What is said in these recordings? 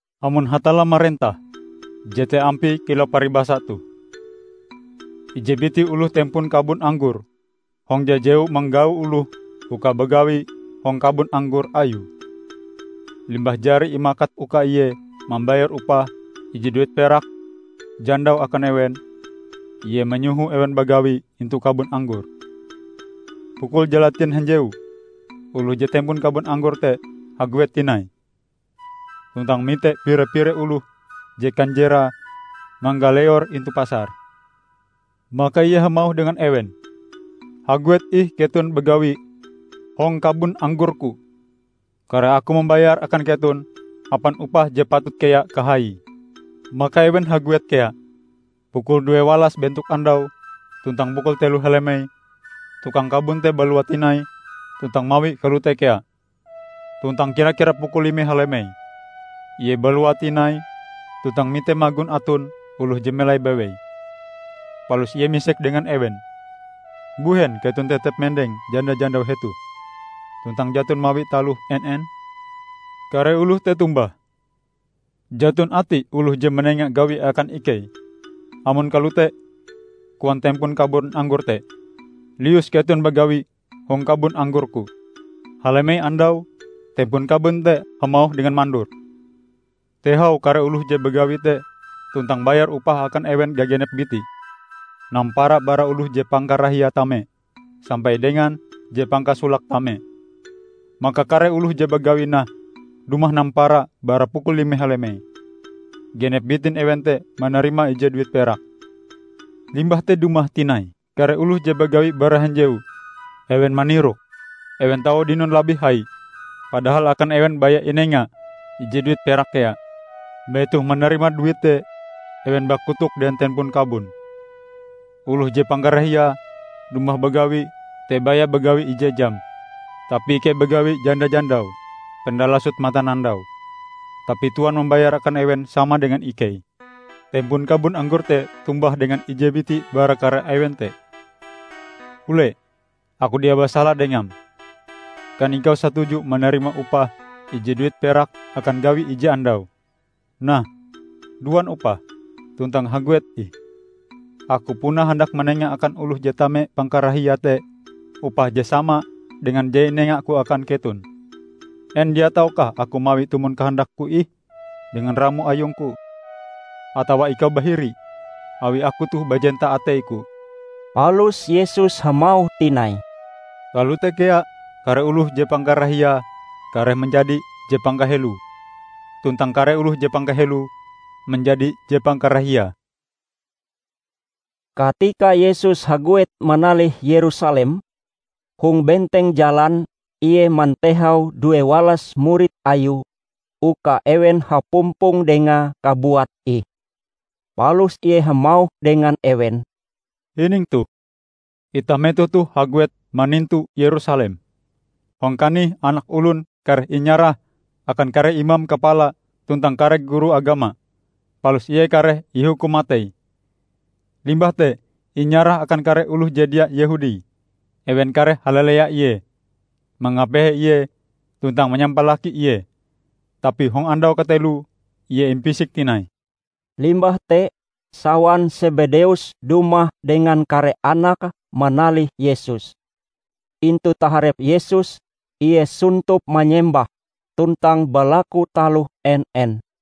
"Amon Hatalla marentah, jete ampie kilau paribasa toh: Ije biti oloh tempon kabon anggor hong jajewu manggau oloh uka bagawi hong kabon anggor ayue. Limbah jari imakat uka ie mambayar upah ije duit perak jandau akan ewen, ie manyoho ewen bagawi intu kabon anggore. Pukul jalatien hanjewu, oloh je tempon kabon anggor te haguet tinai, tuntang mite pire-pire oloh je kanjerae manggaleor intu pasar. Maka ie hamauh dengan ewen, 'Haguet ih keton bagawi hong kabon anggor-Ku. Kareh aku mambayar akan keton hapan upah je patut kea kahaie.' Maka ewen haguet kea. Pukul duewalas bentok andau, tuntang pukul telo halemei, tukang kabon te balua tinai tuntang mawie kalote kea. Tuntang kira-kira pukul lime halemei, ie balua tinai tuntang mite magon aton oloh je melai bewei. Palus ie misek dengan ewen, 'Mbuhen keton tetep mendeng janda-jandau hetoh tuntang jaton mawi taloh en-en?' Kare oloh te tombah, 'Jaton ati oloh je manenga gawi akan ikei.' 'Amon kalote,' koan tempon kabon anggor te, 'lius keton bagawi hong kabon anggor-Ku.' Halemei andau, tempon kabon te hamauh dengan mandure, 'Tehau kare oloh je bagawi te tuntang bayar upah akan ewen gagenep bitie, nampara bara oloh je pangkarahiae tame sampai dengan je pangkasolake tame.' Maka kare oloh je bagawi nah dumah nampara bara pukul lime halemei. Genep bitin ewen te manarima ije duit perak. Limbah te dumah tinai kare oloh je bagawi bara hanjewu. Ewen manirok, ewen tau dinon labih hai. Padahal akan ewen baya inenga ije duit perak kea. Metoh manarima duit te, ewen bakotok dengan tempon kabon. 'Oloh je pangkarahiae dumah bagawi te baya bagawi ije jam. Tapi ikei bagawi janda-jandau penda lasot matanandau, tapi tuan mambayar akan ewen sama dengan ikei!' Tempon kabon anggor te tombah dengan ije biti bara kare ewen te, 'Ule, aku dia basala dengam. Kan ikau satuju manarima upah ije duit perak akan gawi ije andau? Nah, duan upahm, tuntang haguet ih. Aku puna handak manenga akan oloh je tame pangkarahiae te upah je sama dengan je inengaku akan keton. En dia taukah aku mawie tumon kahandakku ih dengan ramo ayungku? Atawa ikau bahiri, awi aku toh bajenta ateiku?' " Palus Yesus hamauh tinai, "Kalote kea kare oloh je pangkarahiae kareh manjadi je pangkaheloe, tuntang kare oloh je pangkaheloe manjadi je pangkarahiae." Katika Yesus haguet manalih Yerusalem, hong benteng jalan Ie mantehau due walas murid Ayue uka ewen hapumpong Dengae kabuat ih. Palus Ie hamauh dengan ewen, "Hining toh! Itah metoh toh haguet manintu Yerusalem. Hong kanih Anak Olon kareh inyarah akan kare imam kapala tuntang kare guru agama. Palus Ie kareh ihukum matei. Limbah te inyarah akan kare oloh je dia Yehudi. Ewen kareh halalea Ie, mangapehe Ie, tuntang manyampalaki Ie. Tapi hong andau kateloe, Ie impisik tinai." Limbah te sawan Sebedeus dumah dengan kare anake manalih Yesus. Intu taharep Yesus Ie sontop manyembah tuntang balaku taloh en-en.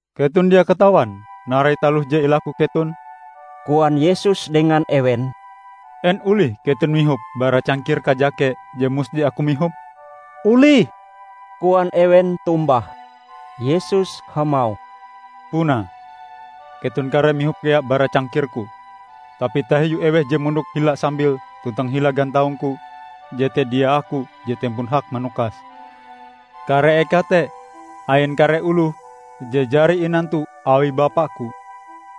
"Keton dia katawan narai taloh je ilaku keton," koan Yesus dengan ewen. "En olih keton mihop bara cangkir kajake je musti Aku mihope?" "Olih," koan ewen tombah. Yesus hamauh, "Punae, keton kareh mihop kea bara cangkir-Ku. Tapi tahiu eweh je mondok hila sambil tuntang hila gantaung-Ku, jete dia Aku je tempon hak manukase. Kare eka te, ain kare oloh je jari inantu awi Bapa-Ku."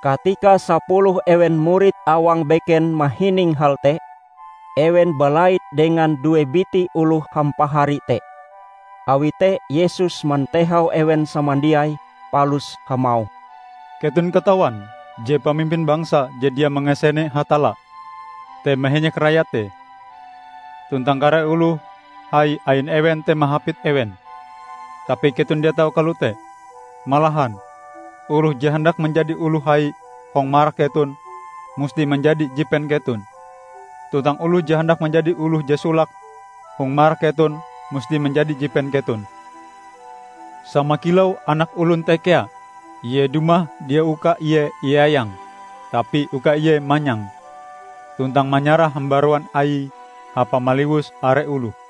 Katika sapuluh ewen murid awang beken mahining hal te, ewen balait dengan due biti oloh hampahari te. Awi te Yesus mantehau ewen samandiai palus hamauh, "Keton katawan je pamimpin bangsa je dia mangasene Hatalla te mahenyek rayate. Tuntang kare oloh hai ain ewen te mahapit ewen. Tapi keton dia tau kalote. Malahan, oloh je handak manjadi oloh hai hong marak keton, musti manjadi jipen keton. Tuntang oloh je handak manjadi oloh je solake hong marak keton, musti manjadi jipen keton. Sama kilau Anak Olon te kea; Ie dumah dia uka Ie iayang tapi uka Ie manyang, tuntang manyarah hambaruan Aie hapa maliwus are oloh."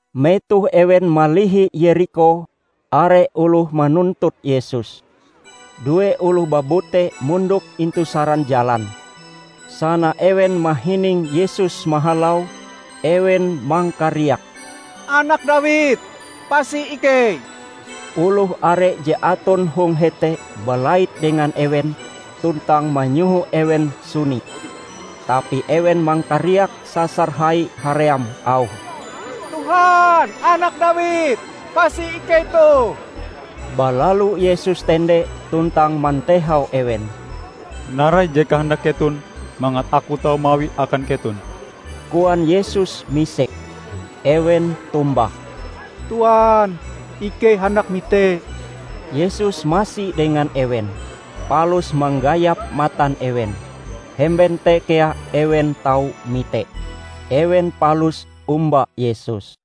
Metoh ewen malihi Yerikho, are oloh manuntut Yesus. Due oloh babute mondok intu saran jalan. Sana ewen mahining Yesus mahalau ewen mangkariak, "Anak Dawid pasi ikei!" Oloh are je aton hong hete balait dengan ewen tuntang manyoho ewen suni. Tapi ewen mangkariak sasar hai haream auhe, "Tuhan, Anak Dawid, pasi ikei toh!" Balalu Yesus tende tuntang mantehau ewen. "Narai je kahandak keton mangat Aku tau mawie akan keton?" koan Yesus misek. Ewen tombah, "Tuan, ikei handak mite!" Yesus masi dengan ewen, palus manggayap matan ewen. Hemben te kea ewen tau mite. Ewen palus omba Yesus.